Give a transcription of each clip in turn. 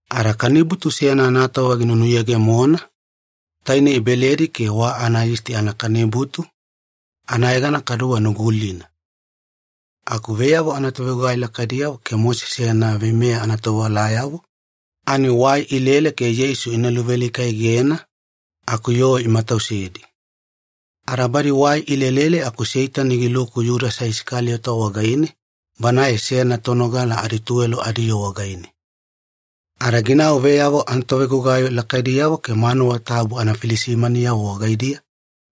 Ada kanibutu seyana anatova ginunuyegemona, tainei Beledi Keke wa Anayisti Anakanibutu, anayegana kaduwe Nugulina. Aku veyavo anatovegugai lakaidiyavo ke Mosese yana veimeya anatovewalayavo, ani wai ilele ke Yeisu ina luvealika-egena, aku yoo imatausedi. Ada badi wai ilelele aku Seitani giluku Yudasa Isakaliyota wagaine, banae seyana tonogala adituwelo adiyoo wagaine. Ada ginau veyavo anatovegugai lakaidiyavo ke manuwa tabu anafilisimaniyavo wagaidiya,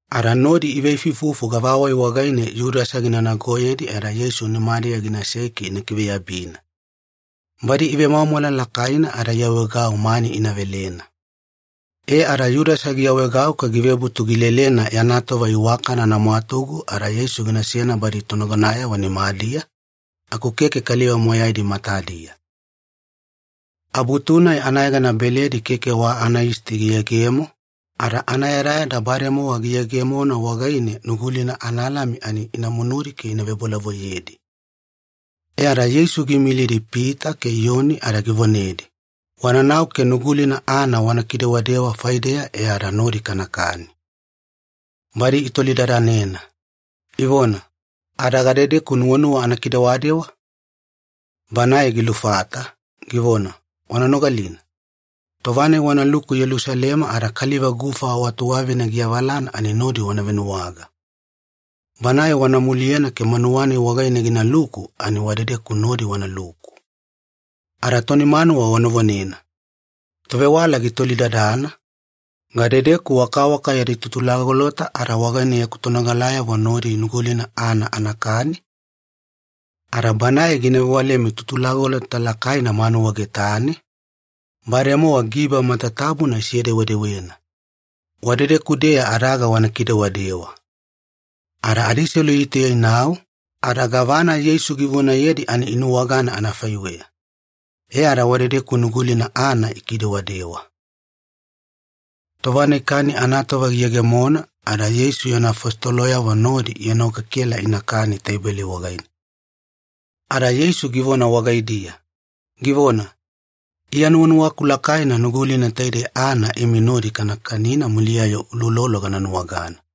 ada nodi iveifuifufu gavawai wagaine Yudasa gina nagoyedi e ada Yeisu nimadiya ginasei ke ina kiveyabina. Badi ivemwamwala lakaina ada iawaegau mani ina velena. E ada Yudasa giawaegau ke givebutu gilelena yana tova iwakana anamwatugu ada Yeisu ginasena badi tonagonayavo nimadiya, aku keke kaliva moyaidi matadiya. Abutu-nai anayegana Beledi Keke wa Anayisti giyegemo, ada anayadayada bademowa giyegemona wagaine Nugulina analami ani ina munudi ke ina vebolavoiyedi. E ada Yeisu giimilidi Pita ke Iyoni ada givonedi, “Wananau ke Nugulina aana wana kidewadewa faideya e ada nodi kanakani.” Badi itolidadanena, ivona, “Ada gadedeku nuwanuwa anakidewadewa?” Banae gilufata, givona, “Wana nogalina. Tova-nai wanaluku Yelusalema ada kaliva gufa wa tuwavina giavalana ani nodi wana venuwaga. Banae wana muliyena ke manuwa-nai wagaine ginaluku ani wadedeku nodi wanaluku. Ada toni manuwa wana vonena, ‘Tovewala gitolidadana, Gadedeku wakawaka yadi tutulagolota ada wagaine yaku tonogalayavo nodi Nugulina aana anakani?’ Ada banae gina vewalemi tutulagolota lakaina manuwa getane, bademowa giba matatabuna isedewedewena. Wadedeku-deya adaga wana kidewadewa.” Ada adiselu itauya inau, ada gavana Yeisu givonayedi ani inuwagana anafaiweya. E ada wadedeku Nugulina aana ikidewadewa. Tova-nai kani anatova giyegemona ada Yeisu yana afositoloyavo nodi ienokekela ke inakani teibeli wagaine. Ada Yeisu givona wagaidiya, givona, “Iya nuwanuwaku lakaina Nugulina taidei aana imi nodi kana kanina muliya-yo uloulolo gana nuwagana.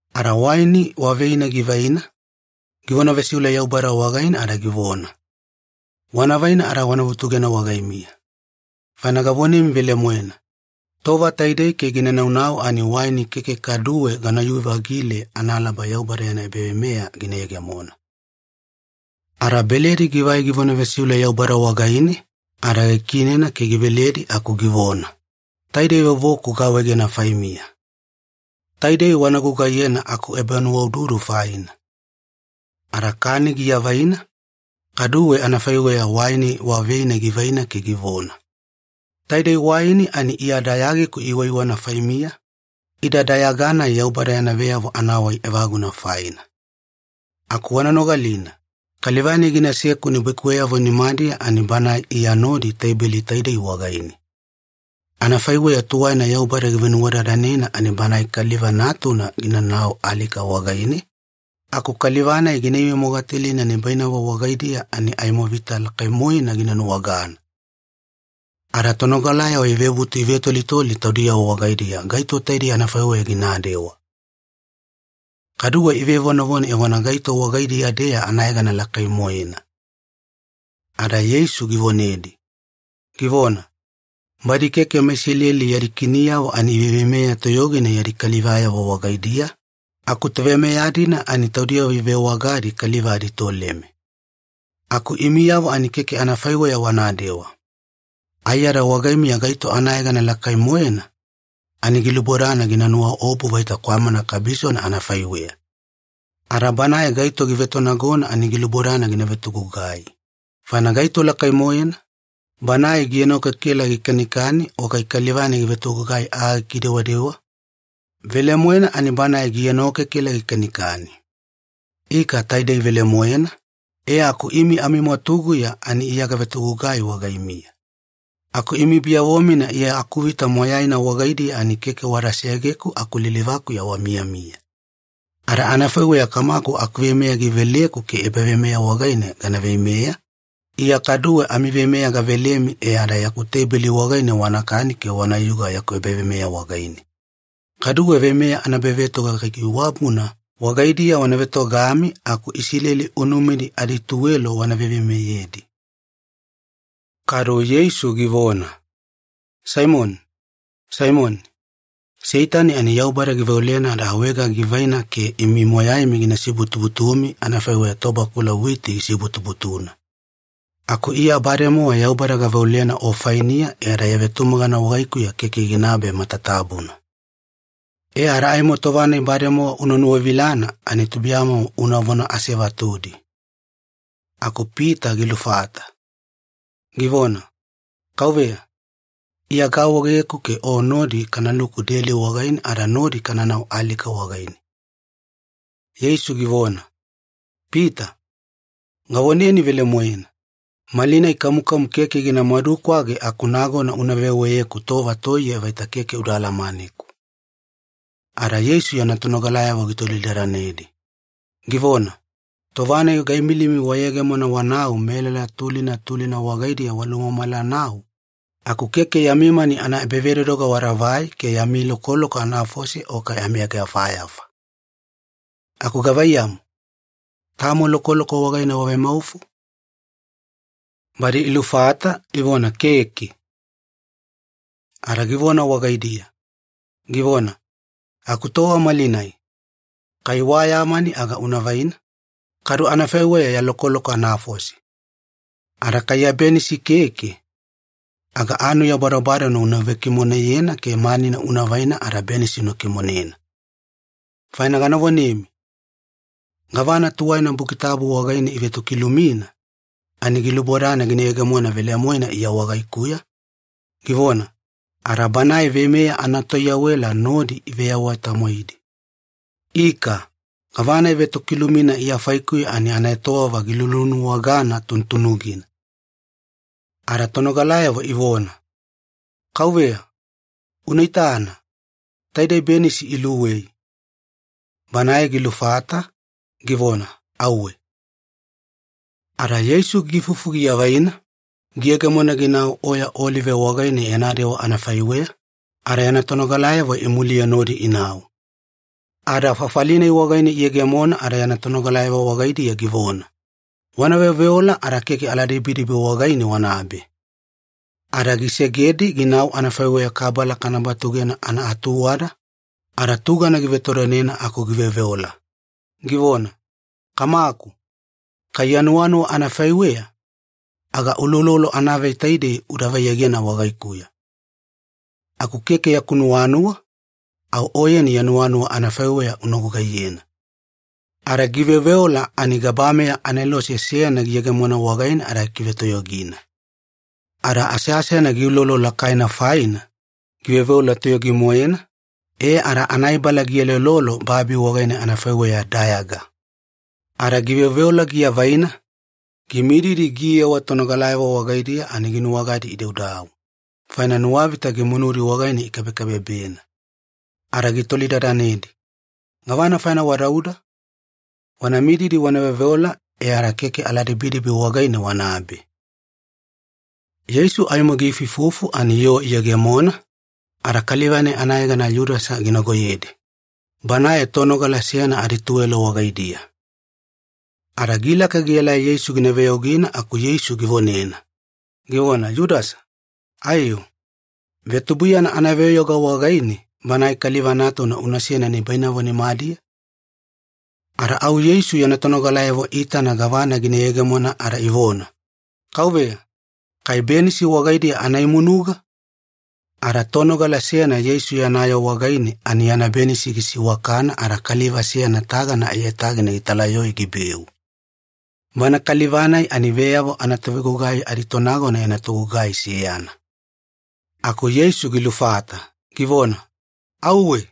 Ada waini wa veina givaina, givona vesiule Yaubada wagaine ada givona, “Wana vaina ada wana vutugena wagaimiya. Faina gavonemi velemoena, tova taidei ke gina naunau ani waini keke kaduwe ganayu-vagile analaba Yaubada yana ebaveimeya gina yegemona.” Ada beledi givai givona vesiule Yaubada wagaine, ada gikiinena ke giveledi aku givona, “Taidei vovoku gaawaegena faimiya. Taidei wana gugaiyena akuebanuwaududu faina.” Ada kani giavaina, kaduwe anafaiweya waini wa veina givaina ke givona, “Taidei waini ani Iya dayagiku iwaiwana faimiya, ida dayaga-nai Yaubada yana veyavo anawai evaguna faina. Aku wana nogalina, kaliva-nai ginaseku nibaikuweyavo nimadiya ani banae Iya nodi teibeli taidei wagaine. Anafaiweya tuwaina Yaubada givenuwadadanena ani Banae Kaliva Natuna ginanau alika wagaine, aku kaliva-nai gina ivemogatalina nibainavo wagaidiya ani aimo vita lakai-moena gina nuwagana!” Ada tonogalayavo ivebutu ivetolitoli taudiyavo wagaidiya gaito taidei anafaiweya ginadewa. Kaduwe ivevonavona evona gaito wagaidiya-deya anayegana lakai-moena. Ada Yeisu givonedi, givona, “Badi keke meIsileli yadi kiniyavo ani iveiveimeya toyogina yadi kalivayavo wagaidiya, aku toveimeya-dina ani taudiyavo ivewagadi kaliva aditoleme. Aku imiyavo ani keke anafaiweya wanadewa. Aiyada wagaimiya gaito anayegana lakai-moena, ani gilubodana gina nuwaobu vaita kwamana kabisona anafaiweya. Ada banae gaito givetonagona ani gilubodana gina vetogugai. Faina gaito lakai-moena? Banae gienokekela gikanikani o kai kaliva-nai givetogugai aa gikidewadewa? Velemoena ani banae gienokekela gikanikani. Ika taidei velemoena, e aku imi amimwatuguya ani Iya gavetogugai wagaimiya. Aku imi biyavo-mina Iya akuvita moyaina wagaidiya ani keke wada segeku aku lilivakuya wamiyamiya. Ada anafaiweya Kamaku akuveimeya giveleku ke ebaveimeya wagaine gana veimeya, Iya kaduwe amiveimeya gavelemi e ada yaku teibeli wagaine wanakani ke wanayuga yaku ebaveimeya wagaine. Kaduwe veimeya anaebavetoga kaikaiwabuna wagaidiya wana vetogami aku Isileli unumidi adituwelo wana veiveimeyedi.” Kadu Yeisu givona, “Saimoni, Saimoni, Seitani ani Yaubada giveolena ada awaega givaina ke imi moyaimi gina sibutubutumi anafaiweya tobakula witi gisibutubutuna. Aku Iya bademowa Yaubada gaveolena o fainiya e ada ya vetumagana wagaikuya keke ginabe matatabuna. E ada aimo tova-nai bademowa una nuwavilana ani tubuiyamomo unavona asevatudi.” Aku Pita gilufata, givona, “Kauveya, Iya gaawaegeku ke O nodi kanaluku deli wagaine ada nodi kananau alika wagaine.” Yeisu givona, “Pita, gavoneni velemoena, malinai kamukamu keke gina madukwage aku nagona una veweyeku tova toiye vaita keke uda alamaneku.” Ada Yeisu tonogalayavo gitolidadanedi, givona, “Tova-nai gaimilimi wayegemona wanau melala tulina tulina wagaidiya walumamala-nau, aku keke yami mani anaebavedodoga wadavai ke yami lokoloko anafose o kai amiageyafayafa. Aku gavaiyamu, tamo lokoloko wagaine wavemaufo?” Badi ilufata, ivona, “Keke.” Ada givona wagaidiya, givona, “Aku tova malinai, kai wa ya mani aga una vaina, kadu anafaiweya ya lokoloko anafose. Ada kai ya benisi keke, aga anuya badobadona una vekimoneyena ke mani una vaina ada benisi una kimonena. Faina gana vonemi, gavana tuwaina Buki Tabu wagaine ivetokilumina, ani gilubodana gina yegemona velemoena Iya wagaikuya, givona, ‘Ada Banae veimeya anatoiyawela nodi iveyawa-tamwaidi.’ Ika, gavana ivetokilumina Iya faikuya ani anaetowava gilulunuwagana tunutunugina.” Ada tonogalayavo ivona, “Kauveya, una itana, taidei benisi iluwei.” Banae gilufata, givona, “Auwe.” Ada Yeisu giifufu giavaina, giyegemona ginau Oya Olive wagaine yana dewa anafaiweya, ada yana tonogalayavo imuliye nodi inau. Ada fafali-nai wagaine iyegemona ada yana tonogalayavo wagaidiya givona, “Wana veoveola ada keke aladibidibi wagaine wanabe.” Ada gisegedi ginau anafaiweya kabala kana batugena anaatuwada, ada tugana givetodonena aku giveoveola, givona, “Kamaku, kai ya nuwanuwa anafaiweya, aga uloulolo anavei taidei uda vaiyegena wagaikuya. Aku keke yaku nuwanuwa, au Oyeni ya nuwanuwa anafaiweya una gugaiyena.” Ada giveoveola ani gabameya anelose seyana giyegemona wagaine ada gikivetoyogina. Ada aseasena giulolo lakaina faina, giveoveola toyogi-moena, e ada anaibala gieloelolo babi wagaine anafaiweya dayaga. Ada giveoveola giavaina, gimididi giyewa tonogalayavo wagaidiya ani ginuwagadi idaudau, faina nuwavita gimunudi wagaine ikabekabebena. Ada gitolidadanedi, “Gavana faina wadauda? Wana mididi wana veoveola e ada keke aladibidibi wagaine wanabe.” Yeisu aimo giifuifufu ani yoo iyegemona, ada kaliva-nai anayegana Yudasa ginagoyedi, banae tonogala seyana adituwelo wagaidiya. Ada gilaka gielai Yeisu gina veyaugina aku Yeisu givonena, givona, “Yudasa, aiyo, vetubuiyana anaveyauga wagaine Banae Kaliva Natuna unasena nibainavo nimadiya?” Ada au Yeisu yana tonogalayavo iitana gavana gina yegemona ada ivona, “Kauveya, kai benisi wagaidiya ana imunuga?” Ada tonogala seyana Yeisu yana yoo wagaine ani yana benisi gisiwakana ada kaliva seyana tagana aiyatagina gitalayoe gibeu. Bana kaliva-nai ani veyavo anatovegugai aditonagona yana togugai seyana. Aku Yeisu gilufata, givona, “Auwe,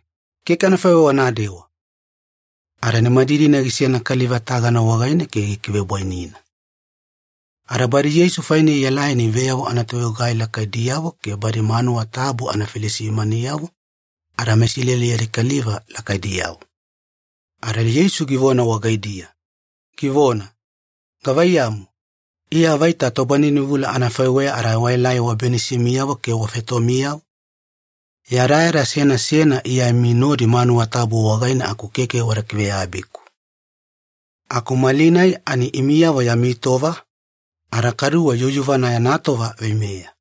keke anafaiweya wanadewa!” Ada nimadidina gisena kaliva tagana wagaine ke gikivebwainina. Ada badi Yeisu faine ielai ani veyavo anatovegugai lakaidiyavo ke badi manuwa tabu anafilisimaniyavo ada meIsileli yadi kaliva lakaidiyavo. Ada Yeisu givona wagaidiya, givona, “Gavaiyamu, Iya vaita tobaninivula anafaiweya ada waelai wabenisimiyavo ke wafetomiyavo? Yadayada seyana seyana Iya imi nodi manuwa tabu wagaine aku keke wada kiveyabiku. Aku malinai ani imiyavo yami tova, ada kaduwe yuyuvana yana tova veimeya.”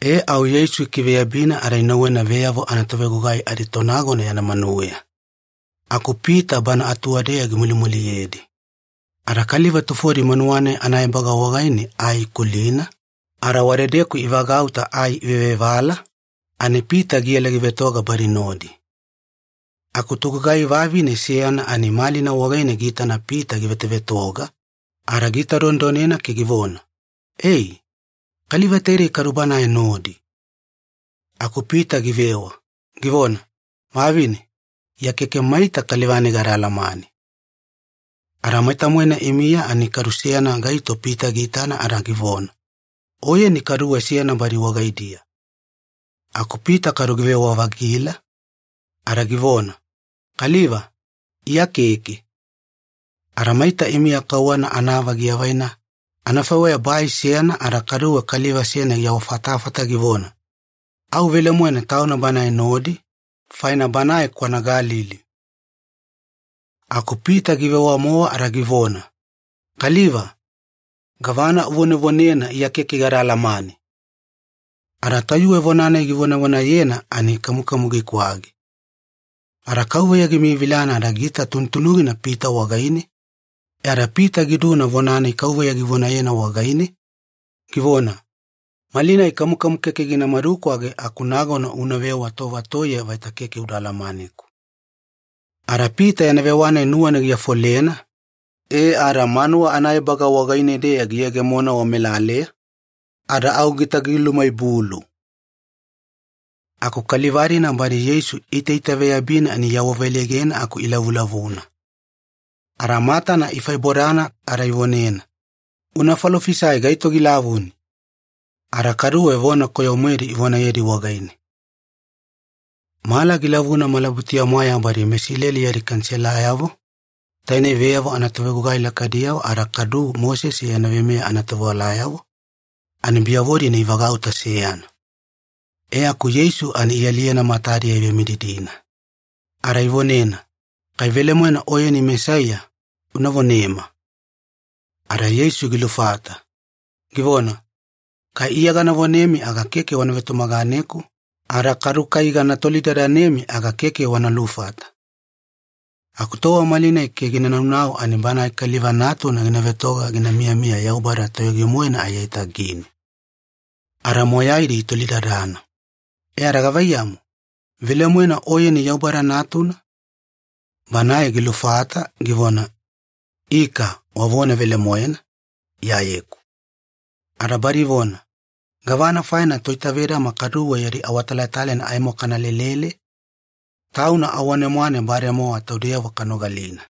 E au Yeisu ikiveyabina ada inauwena veyavo anatovegugai aditonagona yana manuweya. Aku Pita bana atuwadeya gimulimuliyedi. Ada kaliva tufodi manuwa-nai anaebaga wagaine ai ikulina, ada wadedeku ivagauta ai ivevevala, ani Pita giela givetoga badi nodi. Aku togugai vavine seyana ai malina wagaine giitana Pita givetovetoga, ada giitadonedonena ke givona, “Ei! Kaliva taidei kadu Banae nodi.” Aku Pita givewa, givona, “Vavine, Iya keke maita kaliva-nai gada alamane.” Ada maita-moena imiya ani kadu seyana gaito Pita giitana ada givona, “Oyeni kaduwe seyana badi wagaidiya.” Aku Pita kadu givewa-vagila, ada givona, “Kaliva, Iya keke!” Ada maita imiya kauwana anaava givaina anafaiweya bai seyana ada kaduwe kaliva seyana giawafatafata givona, “Au velemoena tauna Banae nodi, faina banae kwana Galili.” Aku Pita givewa-mowa ada givona, “Kaliva, gavana uvonevonena Iya keke gada alamane!” Ada tayuwe vona-nai givonavonayena ani kamukamu gikwage. Ada Kauveya gimiyavilana ada giita tunutunugina Pita wagaine, e ada Pita giduna vona-nai Kauveya givonayena wagaine, givona, “Malinai kamukamu keke gina madukwage aku nagona unavewa tova toiye vaita keke uda alamaneku.” Ada Pita yana vewa-nai nuwana giafolena, e ada manuwa anaebaga wagaine-deya giyegemona wamelaleya, ada au gitagilumaibulu. Aku kaliva-dina badi Yeisu iitaitaveyabina ani iawaveleigena aku ilavulavuna. Ada matana ifaibodana ada ivonena, “Una falofisai gaito gilavuni!” Ada kaduwe vona koyo-moedi ivonayedi wagaine. Mala gilavuna malabutuya-mwaeya badi meIsileli yadi Kaniselayavo, tainei veyavo anatovegugai lakaidiyavo ada kadu Mosese yana veimeya anatovewalayavo, ani biyavo-dina ivagauta seyana. E aku Yeisu ani ialiyena matadiya ivemididina. Ada ivonena, “Kai velemoena Oyeni Mesaiya, una vonema.” Ada Yeisu gilufata, givona, “Kai Iya gana vonemi aga keke wana vetumaganeku, ada kadu kai gana tolidadanemi aga keke wana lufata. Aku tova malinai ke gina naunau ani Banae Kaliva Natuna gina vetoga gina miyamiya Yaubada Totoyogi-moena aiyatagine.” Ada moyaidi itolidadana, “E ada gavaiyamu, velemoena Oyeni Yaubada Natuna?” Banae gilufata, givona, “Ika wavona velemoena, Iyayeku.” Ada badi ivona, “Gavana faina toitavedama kaduwe yadi awatalatalaina aimo kana lelele? Tauna awane-mwane bademowa taudeyavo kanogalina.”